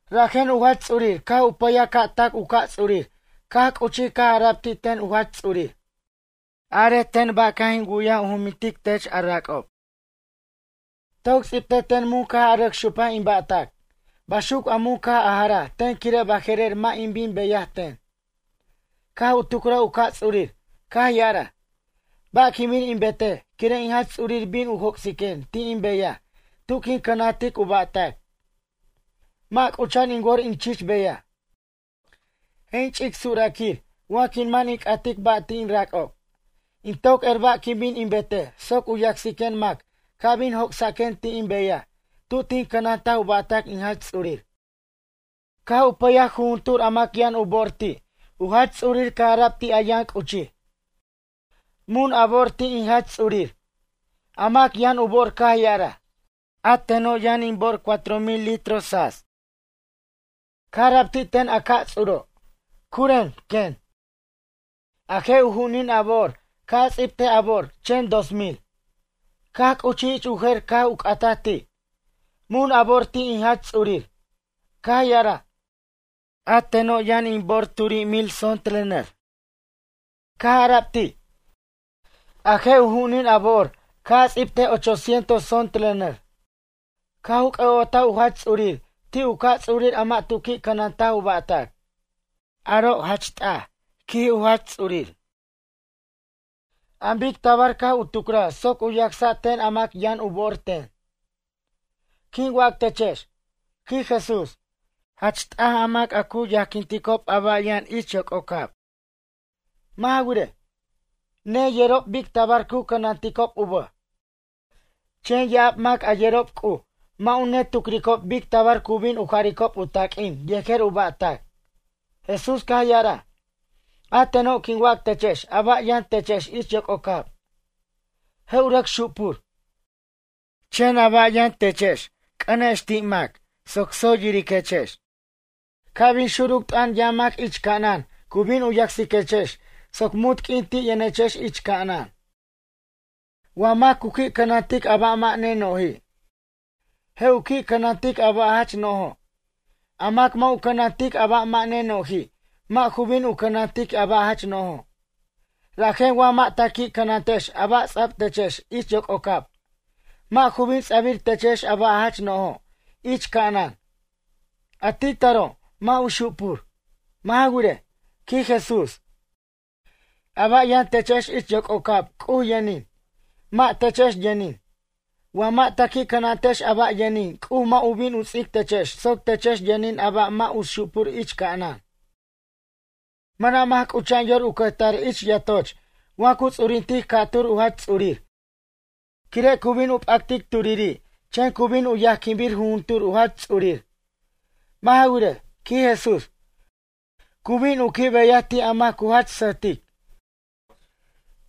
Rajen u Jach Ts'urir caj u pʌyaj ca' tac u ca' ts'urir caj c'uchij caj ara'b ti' ten u Jach Ts'urir: “Arej ten ba' caj in wu'yaj u jumintic tech, a rac'ob? Toc ts'ibtej ten mun caj a rʌc xupaj in ba'tac baxuc a mun caj a jaraj ten quire' baje'rer mʌ' a bin a beyaj ten.” Caj u tucraj u ca' ts'urir caj ya'araj: “Ba' quin bin in betej quire' in jach ts'urir bin u joc'siquen ti' in beyaj tu quin cʌnantic u ba'tac? Mʌ' c'ucha'an in wor in chich beyaj. Je' in ch'ic suraquir wa quin man in c'atic ba' ti' in rac'ob. In toc er ba' quin bin in betej soc u yacsiquen mac ca' bin joc'saquen ti' in beyaj tu tin cʌnantaj u ba'tac in jach ts'ur.” Caj u pʌyaj jujuntur a mac yʌn u bo'or ti' u jach ts'urir caj ara'b ti' a yʌn c'uchij: “Mun a bo'or ti' in jach ts'urir?” A mac yʌn u bo'or caj ya'araj: “A teno' yʌn in bo'or cuatro mil litros tsats.” Caj ara'b ti' ten a ca'ts'uro': “Curen ―quen―, a je' u ju'unin a bo'or ca' a ts'bitej a bo'or chen dos mil.” Caj c'uchij ich u jer caj u c'ataj ti': “Mun a bo'or ti' in jach ts'urir?” Caj ya'araj: “A teno' yʌn in bo'or turi' mil tzontle nʌr.” Caj ara'b ti': “A je' u ju'unin a bo'or ca' a ts'ibtej ocho cientos tzontle nʌr.” Caj u c'ʌ'otaj u jach ts'urir ti' u ca' ts'urir a mʌ' tu qui' cʌnantaj u ba'tac. “Aro', jach t'aj ―quij jach ts'urir―, an bic tabar caj u tucraj soc u yacsa' ten a mac yʌn u bo'or ten.” Quin wac techex ―quij Jesús―, jach t'aj a mac a cu yajquinticob a ba' yʌn ich yoc'ocab. Mʌ' ja wirej, neyerob bic tabar cu cʌnanticob u bʌj. Chen ya'ab mac a yerob C'uj mʌ' u netucricob bic tabar cu bin u jaricob u taq'uin yejer u ba'tac. Jesús caj ya'araj: ―A teno' quin wac techex a ba' yʌn techex ich yoc'ocab. Je' u rʌc xupur. Chen a ba' yʌn techex c'ʌnex ti' mac soc tsoy yiriquechex. Ca' bin xuruc t'ʌn yʌn mac ich ca'anan cu bin u yacsiquechex soc munt q'uin ti' yʌnechex ich ca'anan. ’Wa mac cu qui' cʌnantic a ba' mʌ' neno'ji', je' u qui' cʌnantic a ba' jach no'jo'. A mac mʌ' u cʌnantic a ba' mʌ' neno'ji', mʌ' ju bin u cʌnantic a ba' jach no'jo'. Rajen wa mʌ' ta qui' cʌnantex a ba' ts'a'b techex ich yoc'ocab, mʌ' ju bin ts'abir techex a ba' jach no'jo' ich ca'anan. A ti' taro', mʌ' u xupur. Mʌ' ja wirej ―quij Jesús―, a ba' yʌn techex ich yoc'ocab C'uj yʌnin, mʌ' techex yʌnin. Wa mʌ' ta qui' cʌnantex a ba' yʌnin C'uj mʌ' u bin u ts'ic techex soc techex yʌnin a ba' mʌ' u xupur ich ca'anan. ’Mʌna' mac c'ucha'an yor u cʌjtar ich yatoch wa cu ts'urintic ca'tur u jach ts'urir quire' cu bin u p'actic turiri' chen cu bin u yajquinbir juntur u jach ts'urir. Mʌ' ja wirej ―quij Jesús―, cu bin u qui' beyaj ti' a mac cu jach sʌtic.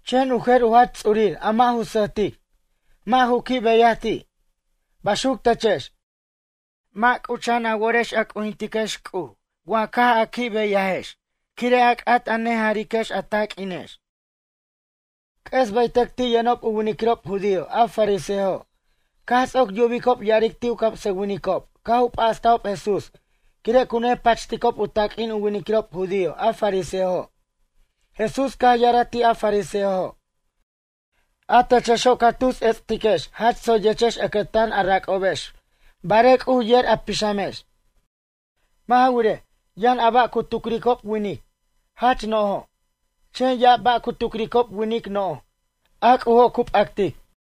Chen u jer u jach ts'ur a mʌ' ju sʌjtic, mʌ' ju qui' beyaj ti'. Baxuc techex. Mʌ' c'ucha'an a worex a c'ujintiquex C'uj wa caj a qui' beyajex quire' a c'at a nejariquex a taq'uinex. C'ʌs bʌytʌc ti' yʌnob u winiquirob judío a fariseojo caj ts'oc yubicob ya'aric ti' u camsʌwinicob caj u p'astajob Jesús quire' cu nepachticob u taq'uin u winiquirob judío a fariseojo'. Jesús caj ya'araj ti' a fariseojo': ―A techexo' ca tus ets'tiquex jach tsoyechex ʌcʌtan a rac'obex barej C'uj yer a pixamex. Mʌ' ja wirej, yʌn a ba' cu tucricob winic, jach no'jo'. Chen ya'ab ba' cu tucricob winic no'j, a C'ujo' cu p'actic.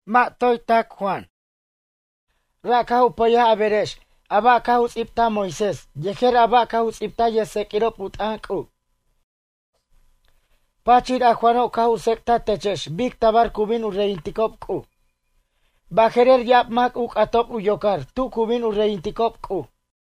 ’Mʌ' toy tac Juan, ra' caj u pʌyaj a berex a ba' caj u ts'ibtaj Moisés yejer a ba' caj u ts'ibtaj yʌjtseq'uirob u t'ʌn C'uj. Pachir a Juano' caj u tsec'taj techex bic tabar cu bin u reyinticob C'uj. Baje'rer ya'ab mac u c'atob u yocar tu cu bin u reyinticob C'uj.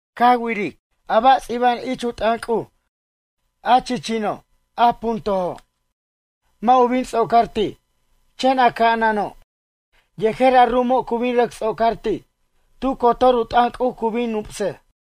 ’Ca wiric, a ba' ts'iba'an ich u t'ʌn C'uj a chichino' a puntojo', mʌ' u bin ts'ocar ti'. Chen a ca'anano' yejer a ru'umo' cu bin rʌc ts'ocar ti'. Tu cotor u t'ʌn C'uj cu bin nupsej.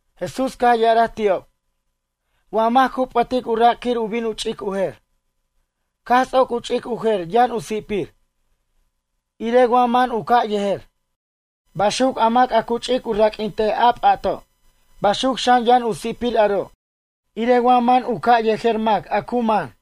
Jesús caj ya'araj ti'ob: ―Wa mac cu p'ʌtic u rac' quir u bin u ch'ic u jer. Caj ts'oc u ch'ic u jer yʌn u si'pir, irej wa man u ca' yejer. Baxuc a mac a cu ch'ic u raq'uintej a p'ato'. Baxuc xan yʌn u si'pir aro' irej wa man u ca' yejer mac a cu man.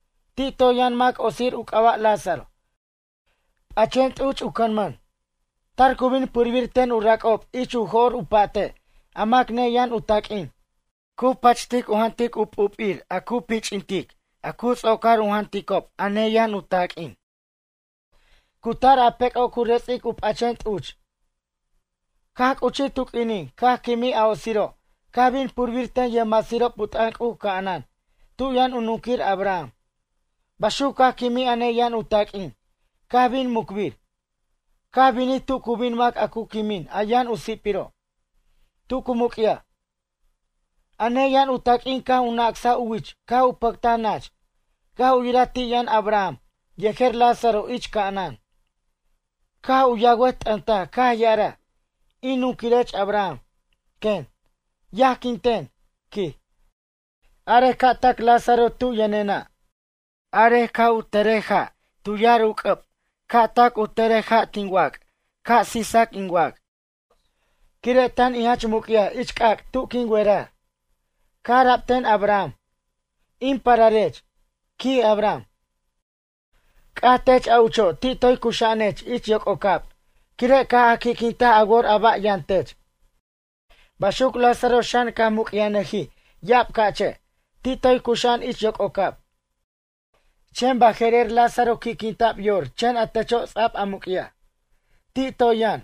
Ti' yʌn mac otsir u c'aba' Lázaro p'achen t'uch u cʌnmʌn. Tar cu bin purbir ten u rac'ob ich u jor u pa'te' a mac neyʌn u taq'uin. Cu pachtic u jantic u p'up'ir a cu pich'intic cu ts'ocar u janticob a neyʌn u taq'uin. Cu tar a pec'o' cu rets'ic u p'achen t'uch. Caj c'uchij tu q'uinin caj quimij a otsiro' caj bin purbir ten yʌjmasirob u t'ʌn C'uj ca'anan tu yʌn u nunquir Abraham. Baxuc caj quimij a neyʌn u taq'uin, caj bin mucbir. Caj binij tu cu bin mac a cu quimin a yʌn u si'piro'. Tu cu muc'yaj, a neyʌn u taq'uin caj u nacsaj u wich caj u pʌctaj nach. Caj u yiraj ti' yʌn Abraham yejer Lázaro ich ca'anan. Caj u yawʌt t'ʌntaj caj ya'araj: “In nunquirech Abraham ―quen―, yajquin ten ―quij―, arej ca' tac Lázaro tu yʌnena'. Arej ca' tʌre ja' tu yar u c'ʌb ca' tac u tʌrej ja' tin wac' ca' sisac in wac' quire' tan in jach muc'yaj ich c'ac' tu quin werar.” Caj ara'b ten Abraham: “In pararech ―quij Abraham―, c'aj tech a ucho' ti' toy cuxa'anech ich yoc'ocab quire' caj a qui'quintaj a wor a ba' yʌn tech. Baxuc Lázaro xan caj muc'yajnʌjij ya'ab ca'che', ti' toy cuxa'an ich yoc'ocab. Chen baje'rer Lázaro qui'quinta'b yor chen a techo' ts'a'b a muc'yaj. Ti' toy yʌn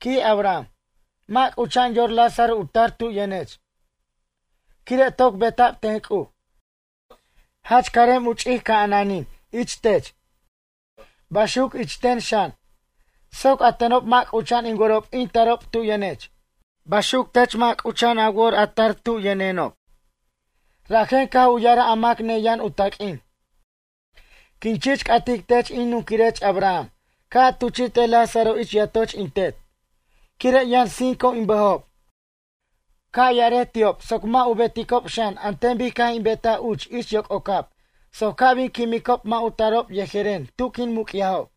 ―quij Abraham―, mʌ' c'ucha'an yor Lázaro u tar tu yʌnech. Quire' toc beta'b ten C'uj, jach carem u ch'ic ca'ananin ich tech, baxuc ich ten xan. Soc a tenob mʌ' c'ucha'an in worob in tarob tu yʌnech. Baxuc tech mʌ' c'ucha'an a wor a tar tub yʌnenob.” Rajen caj u ya'araj a mac neyʌn u taq'uin: “Quin chich c'atic tech in nunquirech Abraham ca' a tuchi'tej Lázaro ich yatoch in tet. Quire' yʌn cinco in bʌjob. Ca' yarej ti'ob soc mʌ' u beticob xan an ten bic caj in betaj uch ich yoc'ocab soc ca' bin quimicob mʌ' u tarob yejeren tu quin muc'yajob.”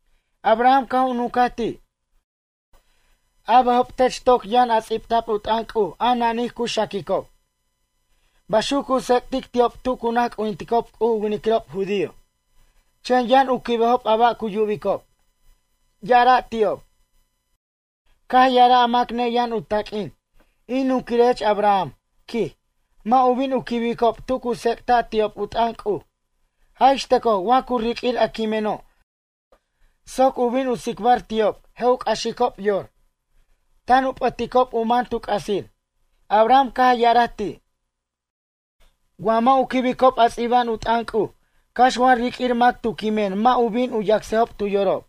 Abraham caj u nuncaj ti': “A bʌjob tech toc yʌn a ts'ibta'b u t'ʌn C'uj a nanij cu xaquicob, baxuc cu tsec'tic ti'ob tu cu naj c'ujinticob C'uj u winiquirob judío. Chen yʌn u quibejob a ba' cu yubicob, ya'ara' ti'ob.” Caj ya'araj a mac neyʌn u taq'uin: “In nunquirech Abraham ―quij―, mʌ' u bin u quibicob tu cu tsec'ta' ti'ob u t'ʌn C'uj. Jaj ixtʌcoj wa cu riq'uir a quimeno' soc u bin u tsicbar ti'ob je' u c'axicob yor, tan u p'ʌticob u man tu c'asir.” Abraham caj ya'araj ti': “Wa mʌ' u quibicob a ts'iba'an u t'ʌn C'uj cax wa riq'uir mac tu quimen mʌ' u bin u yacsejob tu yorob.”